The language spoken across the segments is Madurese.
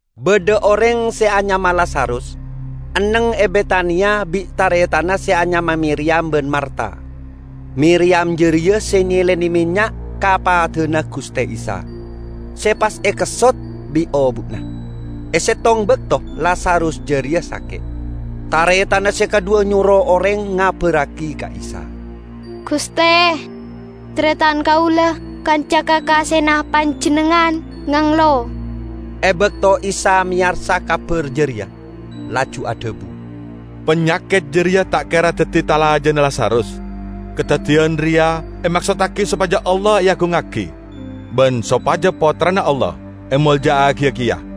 Badha oreng se anyama Lazarus, enneng e Betania bi' taretanna se anyama Miriyam ban Marta. Miriyam jareya se nyelene mennya' ka padana Guste Isa, se pas ekessot bi' obu'na. E settong bakto Lazarus jareya sake'. Taretanna se kadhuwa nyoro oreng ngabarragi ka Isa, "GUSTE, taretan kaula, kanca kakasena Panjennengngan, nganglo." E bakto Isa meyarsa kabar jareya, laju adhabu, "Panyaket jareya ta' kera daddi talajana Lazarus. Kadaddiyan reya emaksottagi sopaja Allah eagungngagi, ban sopaja Pottrana Allah emolja'agiya keya."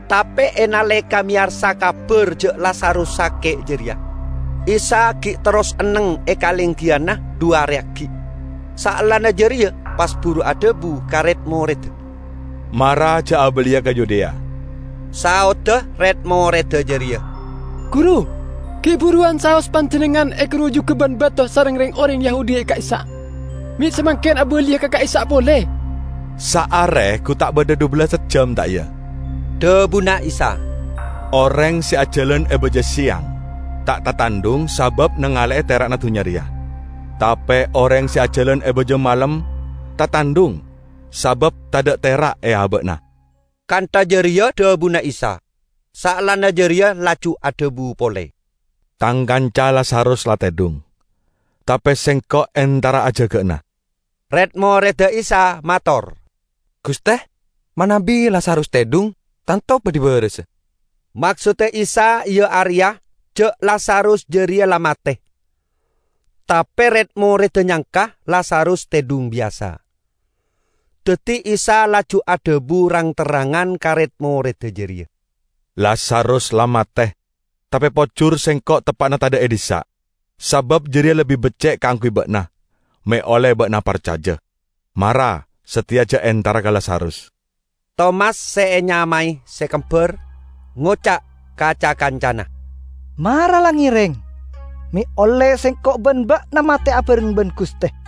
Tape e naleka meyarsa kabar ja' Lazarus sake' jareya, Isa gi' terros enneng e kalenggiyanna dhu are aggi'. Saellana jareya pas buru adhabu ka red-moredda, "Mara ja' abaliya ka Yudea." Saodda red-moredda jareya, "Guru, gi' buruwan saos Panjennengngan egarujuga ban bato sareng reng-oreng Yahudi e ka'issa', me' samangken abaliya ka ka'issa' pole?" "Saare gu ta' badha dhubellas ejjam, ta' iya?" dhabuna Isa. "Oreng se ajalan e baja seyang, ta' tatandhung sabab nangale'e tera'na dunnya reya. Tape oreng se ajalan e baja malem tatandhung, sabab tadha' tera' e aba'na." Kantha jareya dhabuna Isa. Saellana jareya laju adhabu pole, "Tang kanca Lazarus la tedhung; tape Sengko' entara ajaga'ana." Red-moredda Isa mator, "GUSTE, manabi Lazarus tedhung, tanto badhi barasa." Maksodda Isa iya areya ja' Lazarus jareya la mate. Tape red-moredda nyangka Lazarus tedhung biyasa. Daddi Isa laju adhabu rang-terrangan ka red-moredda jareya, "Lazarus la mate. Tape pojur Sengko' teppa'na tadha' e dhissa', sabab jareya lebbi becce' kaangguy ba'na, me' olle ba'na parcaja. Mara sateya ja' entara ka Lazarus." Tomas se enyamae "Se Kembar", ngoca' ka ca-kancana, "Mara la ngereng, me' olle sengko' ban ba'na mate abareng ban GUSTE!"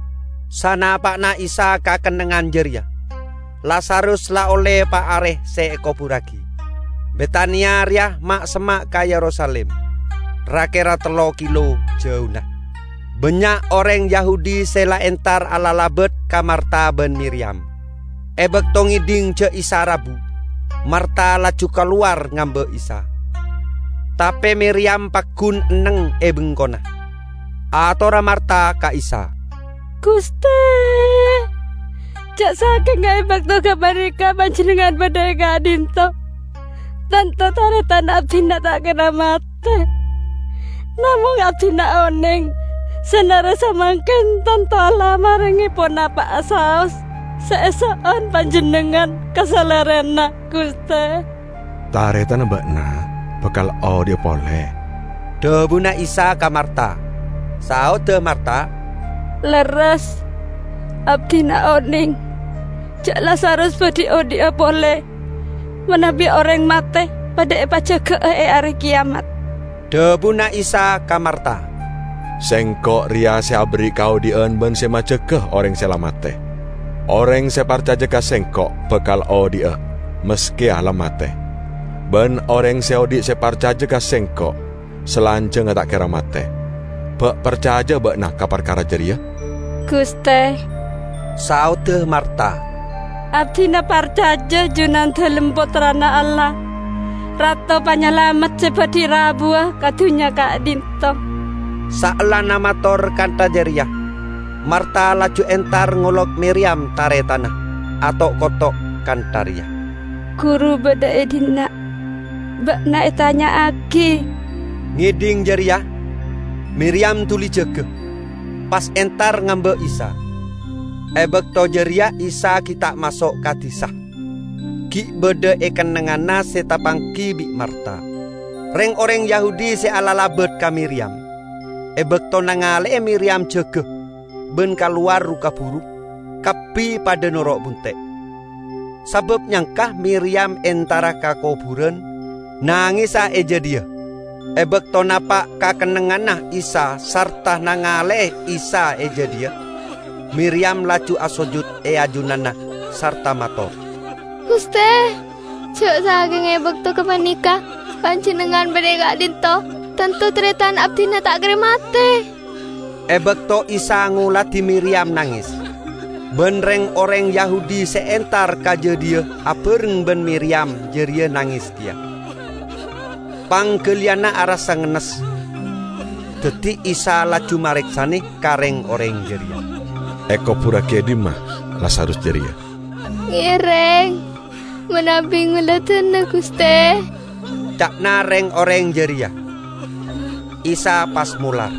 Sanapa'na Isa ka kennengngan jareya, Lazarus la olle pa' are se ekoburragi. Betania reya ma'-semma' ka Yerusalim, ra-kera tello kilo jauna. Bannya' oreng Yahudi se la entar alalabat ka Marta ban Miriyam. E bakto ngedhing ja' Isa rabu, Marta laju kalowar ngamba' Isa, tape Miriyam paggun enneng e bengkona. Atorra Marta ka Isa, "GUSTE, ja' sakenga e bakto gapaneka Panjennengngan badha e ka'dhinto', tanto taretan abdina ta' kera mate. Namong abdina oneng, sanare samangken tanto Allah marenge ponapa'a saos se eso'on Panjennengngan, ka Salerana, GUSTE." "Taretanna ba'na bakal odhi'a pole," dhabuna Isa ka Marta. Saodda Marta, "Lerres, abdina oneng ja' Lazarus badhi odhi'a pole manabi oreng mate padha epajaga'a e Are Keyamat." Dhabuna Isa ka Marta, "Sengko' reya se aberri' kaodhi'an ban se majaga oreng se la mate. Oreng se parcaja ka Sengko' bakal odhi'a, maskeya la mate. Ban oreng se odhi' se parcaja ka Sengko' salanjangnga ta' kera mate. Ba' parcaja'a ba'na ka parkara jareya?" "GUSTE," saodda Marta, "abdina parcaja Junandalem Pottrana Allah, Rato Panyalamet se badhi rabuwa ka dunnya ka'dhinto'." Saellana mator kantha jareya, Marta laju entar ngolok Miriyam, taretanna, ato'-koto' kantha reya, "Guru badha e dhinna'; ba'na etanya'agi." Ngedhing jareya, Miriyam duli jaga, pas entar ngamba' Isa. E bakto jareya Isa gi' ta' maso' ka disa, gi' badha e kennengnganna se tapanggi bi' Marta. Reng-oreng Yahudi se alalabat ka Miriyam, e bakto nangale'e Miriyam jaga ban kalowar ru-kaburu, kabbi padha noro' bunte', sabab nyangka Miriyam entara ka koburan, nangesa e jadhiya. E bakto napa' ka kennengnganna Isa sarta nangale'e Isa e jadhiya, Miriyam laju asojud e ajunanna sarta mator, "GUSTE, ja' sakenga e bakto gapaneka Panjennengngan badha e ka'dhinto', tanto taretan abdina ta' kera mate." E bakto Isa ngoladi Miriyam nanges, ban reng-oreng Yahudi se entar ka jadhiya abareng ban Miriyam jareya nanges keya, panggaliyanna arassa ngennes. Daddi Isa laju mareksane ka reng-oreng jareya, "Ekoburragi e dhimma Lazarus jareya?" "Ngereng manabi ngoladana, GUSTE," ca'na reng-oreng jareya. Isa pas molar.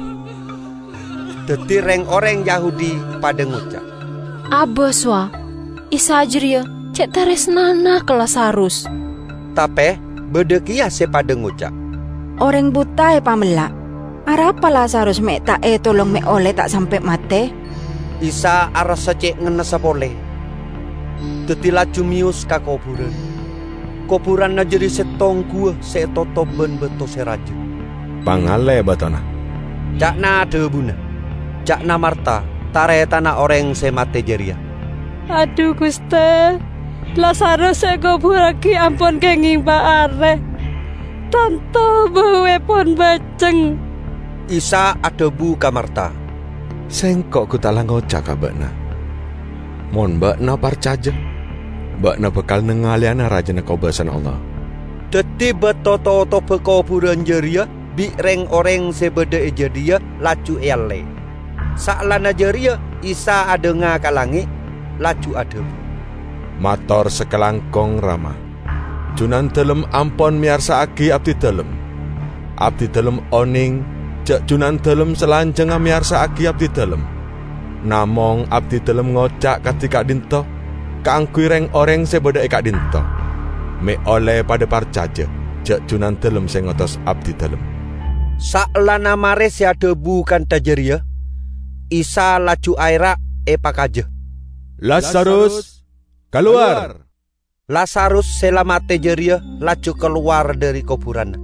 Daddi reng-oreng Yahudi padha ngoca', "Abas, wa, Isa jareya ce' taresnana ka Lazarus!" Tape badha keya se padha ngoca', "Oreng buta epamella', arapa Lazarus me' ta' etolong me' olle ta' sampe' mate?" Isa arassa ce' ngennessa pole, daddi laju meyos ka koburan. Koburanna jareya settong guwa se etotop ban bato se raja. "Pangalle batona," ca'na dhabuna. Ca'na Marta, taretanna oreng se mate jareya, "Adhu, GUSTE, Lazarus se ekoburragi ampon kengeng pa' are. Tanto bauepon baceng!" Isa adhabu ka Marta, "Sengko' gu ta' la ngoca' ka ba'na, mon ba'na parcaja, ba'na bakal nangaleyana rajana kobasana Allah!" Daddi bato totobba koburan jareya bi' reng-oreng se badha e jadhiya laju ealle. Saellana jareya Isa adhanga ka langnge', laju adhabu, "Mator sakalangkong, Rama, Junandalem ampon meyarsa'agi Abdidalem. Abdidalem oneng ja' Junandalem salanjangnga meyarsa'agi abdidalem, namong Abdidalem ngoca' kadi ka'dhinto' kaangguy reng-oreng se badha e ka'dhinto', me' olle padha parcaja ja' Junandalem se ngotos Abdidalem." Saellana mare se adhabu kantha jareya, Isa laju aera' epakaja, "Lazarus, kalowar!" Lazarus se la mate jareya laju kalowar dhari koburanna.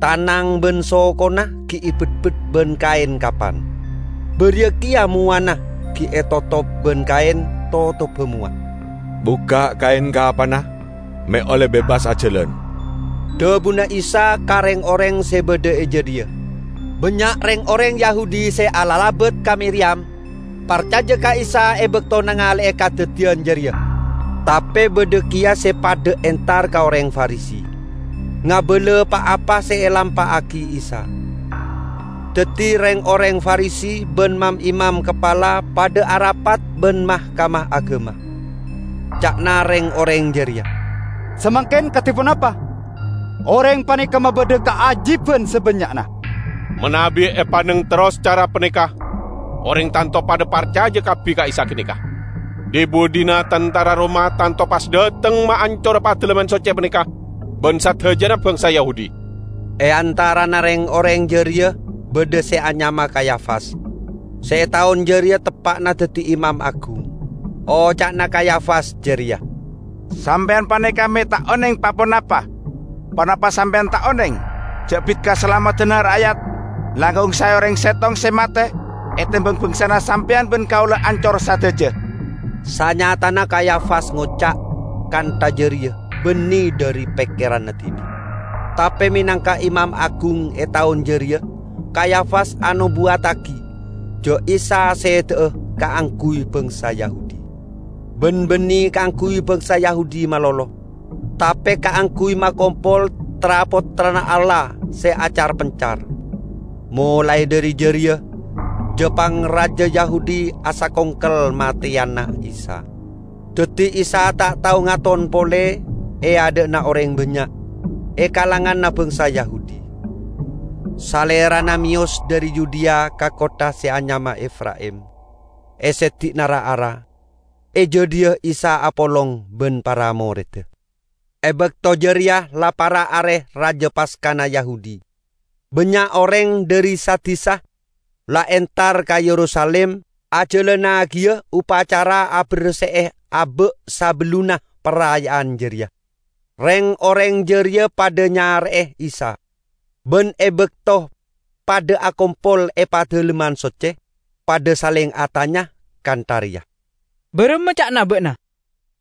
Tanang ban sokona gi' ebetbet ban kaen kapan, bariya keya mowana gi' etotop ban kaen totobba mowa. "Bukka' kaen kapanna me' olle bebas ajalan," dhabuna Isa ka reng-oreng se badha e jadhiya. Bannya' reng-oreng Yahudi se alalabat ka Miriyam, parcaja ka Isa e bakto nangale'e kadaddiyan jareya. Tape badha keya se padha entar ka oreng Farisi, ngabala pa-apa se elampa'agi Isa. Daddi reng-oreng Farisi ban mam-imam kapala padha arapat ban Mahkamah Agama. Ca'na reng-oreng jareya, "Samangken kadi ponapa? Oreng paneka mabadha kaajiban sabannya'na. Manabi epanneng terros cara paneka oreng tanto padha parcaja kabbi ka Isa ganeka. Dhi-budhina tantara Roma tanto pas dhateng maancora Padalemman Socce paneka ban sadajana bangsa Yahudi." E antarana reng-oreng jareya badha se anyama Kayafas, se e taon jareya teppa'na daddi imam agung. Oca'na Kayafas jareya, "Sampeyan paneka me' ta' oneng pa-ponapa! Ponapa sampeyan ta' oneng ja' bit kasalameddanna ra'yat langkong sae oreng settong se mate etembang bangsana sampeyan ban kaula ancor sadaja?" Sanyatana Kayafas ngoca' kantha jareya banne dhari pekkeranna dibi'. Tape menangka imam agung e taon jareya Kayafas anobuwaddagi ja' Isa seda'a kaangguy bangsa Yahudi. Ban banne kaangguy bangsa Yahudi malolo, tape kaangguy makompol tra-pottrana Allah se acar-pencar. Molae dhari jareya ja-pangraja Yahudi asakongkel mateyana Isa. Daddi Isa ta' tao ngaton pole e adha'na oreng bannya' e kalanganna bangsa Yahudi. Salerana meyos dhari Yudea ka kottha se anyama Efraim e seddi'na ra-ara. E jadhiya Isa apolong ban para moredda. E bakto jareya la para' Are Raja Paskana Yahudi. Bannya' oreng dhari sa-disa la entar ka Yerusalim ajalannagiya opacara aberse'e aba' sabellunna paraya'an jareya. Reng-oreng jareya padha nyare'e Isa, ban e bakto padha akompol e Padalemman Socce, padha saleng atanya kantha reya, "Baramma ca'na ba'na?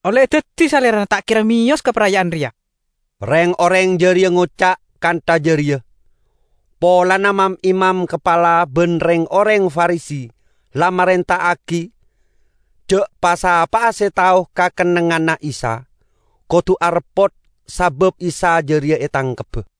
Olle daddi Salerana ta' kera meyos ka paraya'an reya." Reng-oreng jareya ngoca' kantha jareya polana mam-imam kapala ban reng-oreng Farisi la marenta'agi ja' pa'-sapa'a se tao ka kennengnganna Isa, kodu areppot sabab Isa jareya etangkebba.